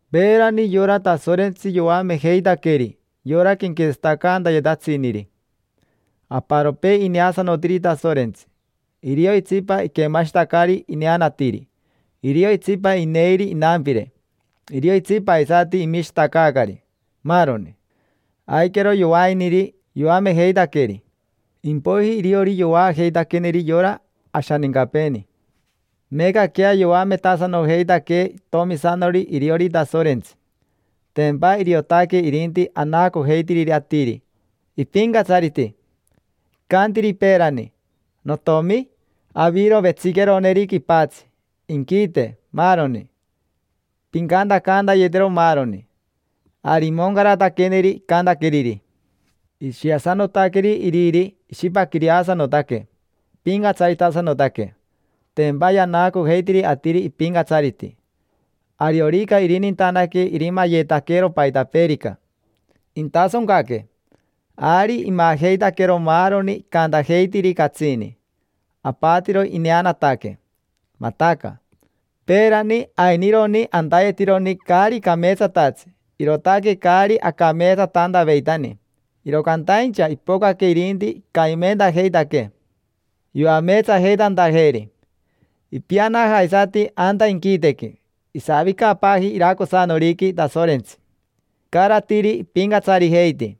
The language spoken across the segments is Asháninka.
Peerani yora Tasorentsi yoamejeitaqueri yora quenquetsatacantayetatsiniri. Aparopee ineasanotiri Tasorentsi, irio itsipa iquemashitacari ineanatiri, irio itsipa ineiri inampire, irio itsipa aisati imishitacaacari, maaroni. Aiquero yovainiri, aiquero yovainiri, yoamejeitaqueri. Impoiji iriori yovaajeitaqueneri yora ashanincapeeni. Meecaquea yoametasanojeitaquee itomisanori iriori Tasorentsi. Tempa iriotaque irinti anaacojeitiriri atiri ipincatsariti. Icantiri peerani: “Notiomi, aviro vetsiqueroneri quipatsi, inquite, maaroni; pincantacantayetero maaroni”. Ari imoncarataqueneri icantaqueriri. Ishiasanotaqueri iriri, ishipaquireasanotaque, ipincatsaritasanotaque. Tempa yanaacojeitiri atiri ipincatsariti. Ariorica irinintanaque irimayetaquero paitapeerica, intasoncaque. Ari imajeitaquero maaroni icantajeitiri catsini: apatiro ineanataque, mataca. Peerani ainironi antayetironi caari cameetsatatsi, irootaque caari acameetsatantaveitani. Iro cantaincha ipocaque irinti icamimentajeitaquee yoameetsajeitantajeeri. Ipianaja aisati anta inquitequi, isavicapaaji iracosanoriqui Tasorentsi, icaratiri ipincatsarijeiti.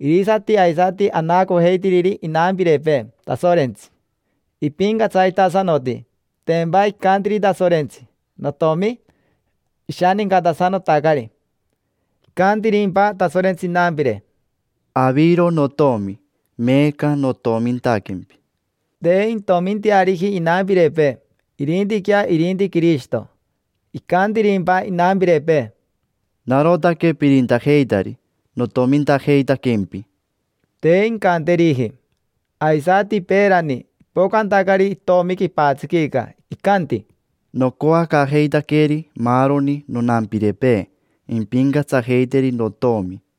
Irisati aisati anaacojeitiriri inampirepee Tasorentsi, ipincatsaritasanoti, tempa icantiri Tasorentsi: “Notomi”. Ishanincatasanotacari. ¿Icantirimpa Tasorentsi inampire: “Aviro notomi, meeca notomintaquempi”? Te intominteariji inampirepee, irintiquea irinti Quirishito. ¿Icantirimpa inampirepee: “Narotaque pirintajeitari, notomintajeitaquempi”? Te incanteriji. Aisati peerani, ipocantacari itomi quipatsiquica, icanti: “Nocoacaajeitaqueri maaroni nonampirepee impincatsajeiteri notomi”.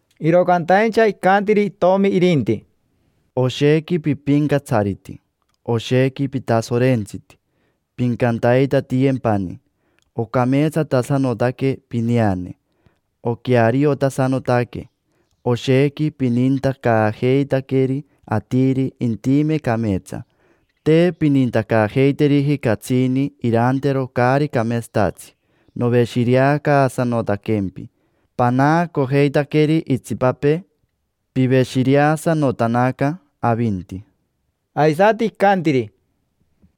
Iro cantaincha icantiri Itomi irinti: “Oshequi pipincatsariti, oshequi pitasorentsiti: pincantaitatiyempani. Ocameetsatasanotaque pineane, oqueariotasanotaque. Oshequi pinintacaajeitaqueri atiri intime cameetsa; te pinintacaajeiteriji catsini irantero caari cameetsatatsi. Noveshireacaasanotaquempi, panaacojeitaqueri itsipapee piveshireasanotanaca avinti”. Aisati icantiri: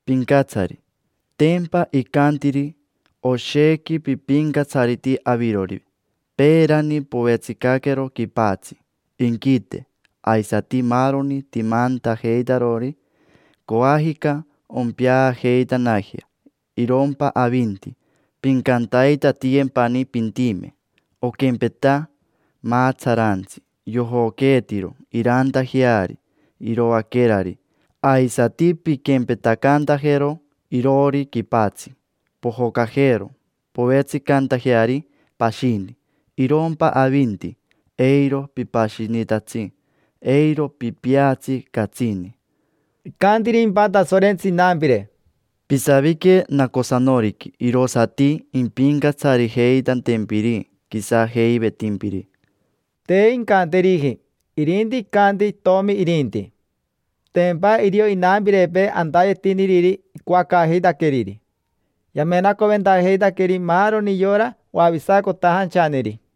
“Pincatsari”; tempa icantiri: “Oshequi pipincatsariti avirori. Peerani povetsicaquero quipatsi, inquite, aisati maaroni timantajeitarori. Coajica ompeajeitanajea, irompa avinti pincantaitatiyempani pintime. Oquempeta maatsaraantsi yojoqueetiro irantajeari iroaquerari, aisati pinquempetacantajero iroori quipatsi: pojocajero povetsicantajeari pashini. Irompa avinti, eiro pipashinitatsi, eiro pipeatsi catsini”. ¿Icantirimpa Tasorentsi inampire: “Pisavique nacosanoriqui irosati impincatsarijeitantempiri quisajeivetimpiri”? Te incanteriji, irinti icanti itomi irinti. Tempa irio inampirepee antayetiniriri icoacaajeitaqueriri: yamenacoventajeitaqueri maaroni yora oavisacotajanchaneri.